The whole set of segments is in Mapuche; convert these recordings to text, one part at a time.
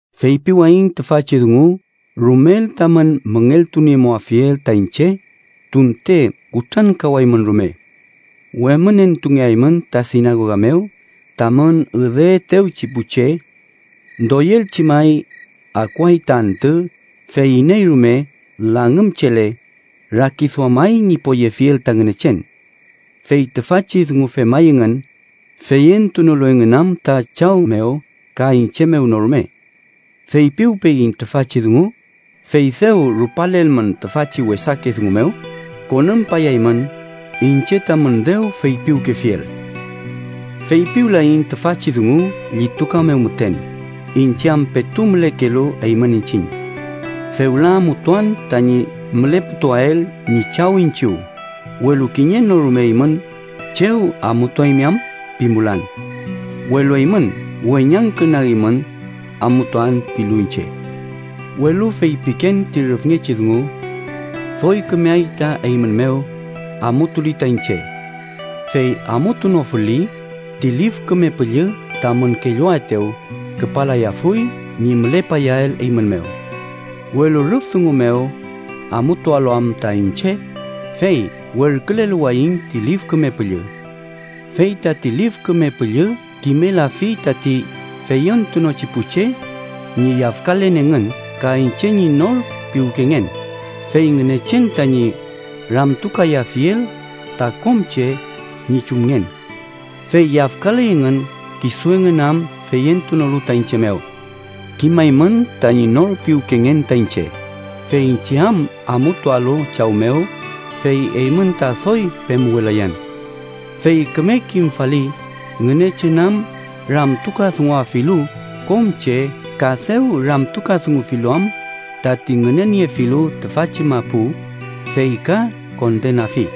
“Feypiwayiñ tüfachi dungu rumel tamün müngeltuniemuafiel ta iñche tunte kutrankawaymün rume. Wemünentungeaymün ta sinagoga mew tamün üdeetewchi pu che. Doyelchi may, akuay ta antü fey iney rume langümchele, rakiduamay ñi poyefiel ta Ngünechen. Fey tüfachi dungu femay engün, feyentunolu engün am ta Chaw mew ka iñche mew no rume. Feypiwpeyiñ tüfachi dungu, fey dew rupalelmün tüfachi wesake dungu mew, konümpayaymün iñche tamün dew feypiwkefiel. “Feypiwlayiñ tüfachi dungu llituka mew müten, iñche am petu mülekelu eymün iñchiñ. Fewla amutuan tañi müleputuael ñi Chaw iñchiw, welu kiñe no rume eymün ‘¿chew amutuaymi am?’ pimulan. Welu eymün weñangkünagimün ‘amutuan’ pilu iñche. Welu feypiken ti rüfngechi dungu: doy kümey ta eymün mew, amutuli ta iñche. Fey amutunofuli, ti Lif Küme Püllü tamün kelluaetew küpalayafuy ñi mülepayael eymün mew. Welu rüf dungu mew amutualu am ta iñche, fey werküleluwayiñ ti Lif Küme Püllü. Fey tati Lif Küme Püllü kimelafi tati feyentunochi pu che ñi yafkalen engün ka iñche ñi nor piwkengen, fey Ngünechen tañi ramtukayafiel ta kom che ñi chumngen. Fey yafkaley engün kisu engün am feyentunolu ta iñche mew. Kimaymün tañi nor piwkengen ta iñche, fey iñche am amutualu Chaw mew fey eymün ta doy pemuwelayan. Fey küme kimfali Ngünechen am ramtukadunguafilu kom che ka dew ramtukadungufilu am tati ngüneniefilu tüfachi mapu, fey ka kondenafi.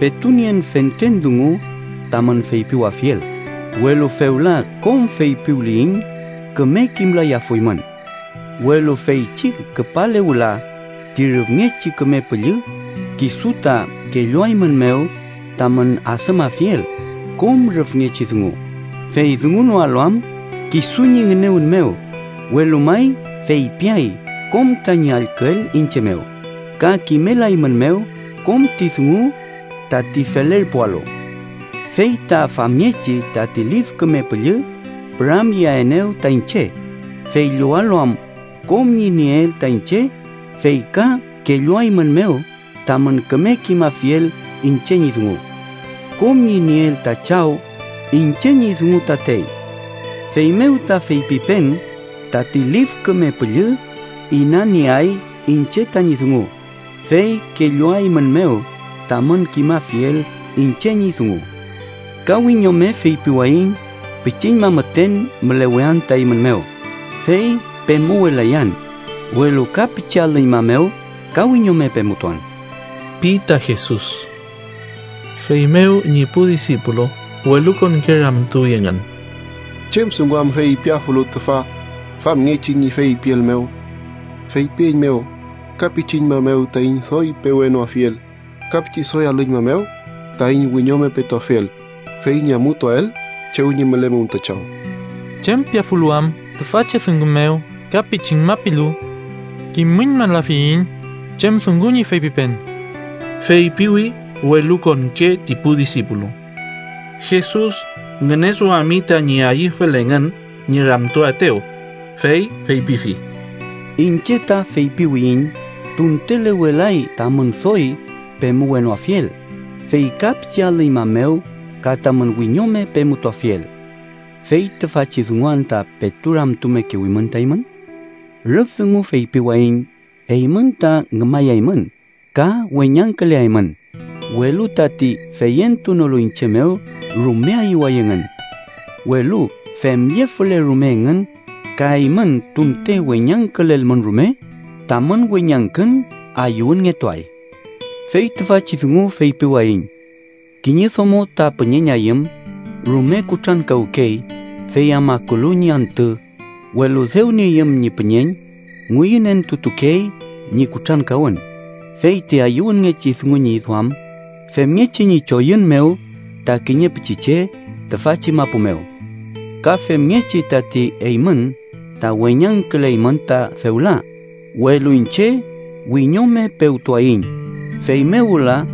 “Petu nien fentren dungu tamün feypiwafiel, welu fewla kom feypiwliyiñ küme kimlayafuymün. Welu feychi küpale wüla ti Rüfngechi Küme Püllü kisu ta kelluaeymünmew tamün adümafiel kom rüfngechi dungu, fey dungunoalu am kisu ñi ngünewün mew, welu may feypiay kom tañi allküel iñche mew, ka kimelaeymünmew kom ti dungu tati felerpualu. Fey ta famngechi tati Lif Küme Püllü püramyeaenew ta iñche, fey llowalu am kom ñi nieel ta iñche fey ka kelluaeymünmew tamün küme kimafiel iñche ñi dungu. Kom ñi nieel ta Chaw iñche ñi dungu tatey. Feymew ta feypipen tati Lif Küme Püllü inanieay iñche tañi dungu, fey kelluaeymünmew tamün kimafiel iñche ñi dungu. “Ka wiñome feypiwayiñ pichiñma müten mülewean ta eymün mew, fey pemuwelayan, welu ka pichi alüñma mew ka wiñome pemutuan” pi ta Jesus. Feymew ñi pu disipulu welukonke ramtuwi engün: “¿Chem dungu am feypiafulu tüfa famngechi ñi feypiel mew? Feypieiñmew ‘ka pichiñma mew taiñ doy pewenoafiel’, ka ‘pichi doy alüñma mew taiñ wiñome petuafiel, fey ñi amutuael chew ñi mülemum ta Chaw’. ¿Chem piafulu am tüfachi dungun mew ‘ka pichiñma’ pilu? Kimüñmalafiyiñ chem dungu ñi feypipen” feypiwi welukonke ti pu disipulu. Jesus ngüneduami tañi ayüfel engün ñi ramtuaetew, fey feypifi: —Iñche ta feypiwiyiñ tuntelewelay tamün doy pemuwenoafiel fey ka pichi alüñma mew ka tamün wiñome pemutuafiel. ¿Fey tüfachi dungu anta petu ramtumekewimün ta eymün? Rüf dungu feypiwayiñ eymün ta ngümayaymün ka weñangküleaymün, welu tati feyentunolu iñche mew rume ayüway engün. Welu femllefule rume engün ka eymün tunte weñangkülelmün rume, tamün weñangkün ayüwünngetuay. Fey tüfachi dungu feypiwayiñ: kiñe domo ta püñeñayüm, rume kutrankawkey fey am akulu ñi antü, welu dew nieyüm ñi püñeñ, ngüyünentutukey ñi kutrankawün fey ti ayüwünngechi dungu ñi duam, femngechi ñi choyün mew ta kiñe pichiche tüfachi mapu mew. Ka femngechi tati eymün ta weñangküleymün ta fewla, welu iñche wiñome pewtuayiñ, feymew wüla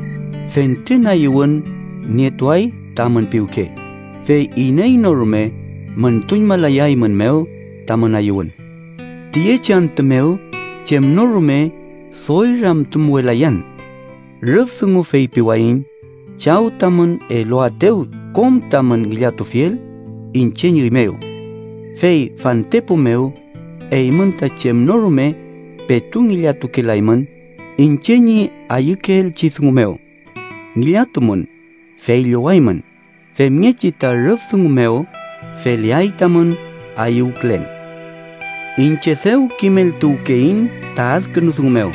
fentren ayüwün nietuay tamün piwke, fey iney no rume müntuñmalayaeymünmew tamün ayüwün. “Tüyechi antü mew chem no rume doy ramtumuwelayan. Rüf dungu feypiwayiñ Chaw tamün eluaetew kom tamün ngillatufiel iñche ñi üy mew. Fey fantepu mew, eymün ta chem no rume petu ngillatukelaymün iñche ñi ayükeelchi dungu mew. Ngillatumün, fey llowaymün, femngechi ta rüf dungu mew feleay tamün ayüwkülen. “Iñche dew kimeltuwkeyiñ ta adkünu dungu mew,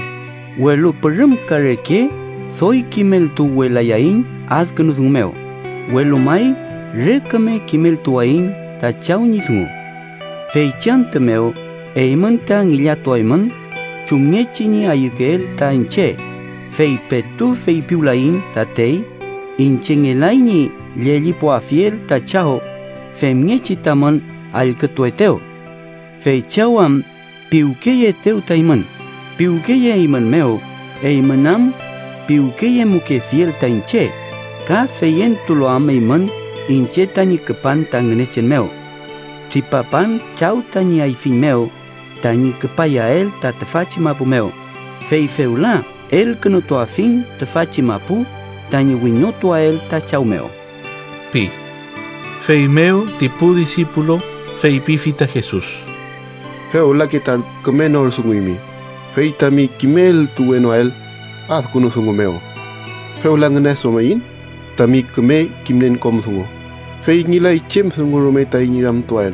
welu pürümka reke doy kimeltuwewlayayiñ adkünu dungu mew, welu may re küme kimeltuwayiñ ta Chaw ñi dungu. Feychi antü mew eymün ta ngillatuaymün chumngechi ñi ayükeel ta iñche, fey petu feypiwlayiñ tatey iñche ngelay ñi llellipuafiel ta Chaw femngechi tamün allkütuetew. Fey Chaw am piwkeyeetew ta eymün, piwkeyeeymünmew eymün am piwkeyemukefiel ta iñche, ka feyentulu am eymün iñche tañi küpan ta Ngünechen mew. Tripapan Chaw tañi ayfiñ mew tañi küpayael ta tüfachi mapu mew, fey fewla elkünutuafiñ tüfachi mapu tañi wiñotuael ta Chaw mew” pi. Feymew ti pu disipulu feypifi ta Jesus: —Fewlake ta küme nor dunguymi, fey tami kimeltuwenoael adkünu dungu mew. Fewla ngüneduamiyiñ tami küme kimnien kom dungu, fey ngelay chem dungu rume taiñ ramtuael.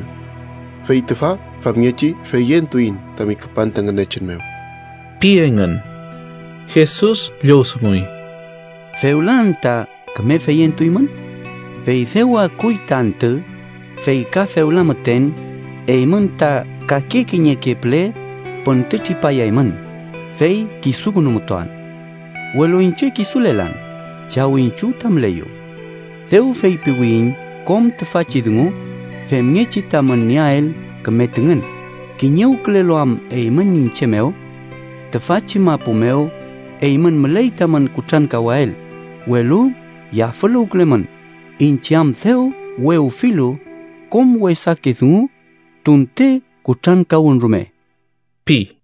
Fey tüfa famngechi feyentuiñ tami küpan ta Ngünechen mew ―pi engün. Jesus llowdunguy: —¿Fewla anta küme feyentuymün? Fey dew akuy ta antü, fey ka fewla müten, eymün ta kake kiñeke püle püntütripayaymün, fey kisukünumutuan. Welu iñche kisulelan, Chaw iñchiw ta müleyu. Dew feypiwiyiñ kom tüfachi dungu femngechi tamün nieael küme tüngün kiñewkülelu am eymün iñche mew. Tüfachi mapu mew eymün müley tamün kutrankawael, welu yafüluwkülemün, iñche am dew wewfilu kom wesake dungu tunte kutrankawün rume ―pi.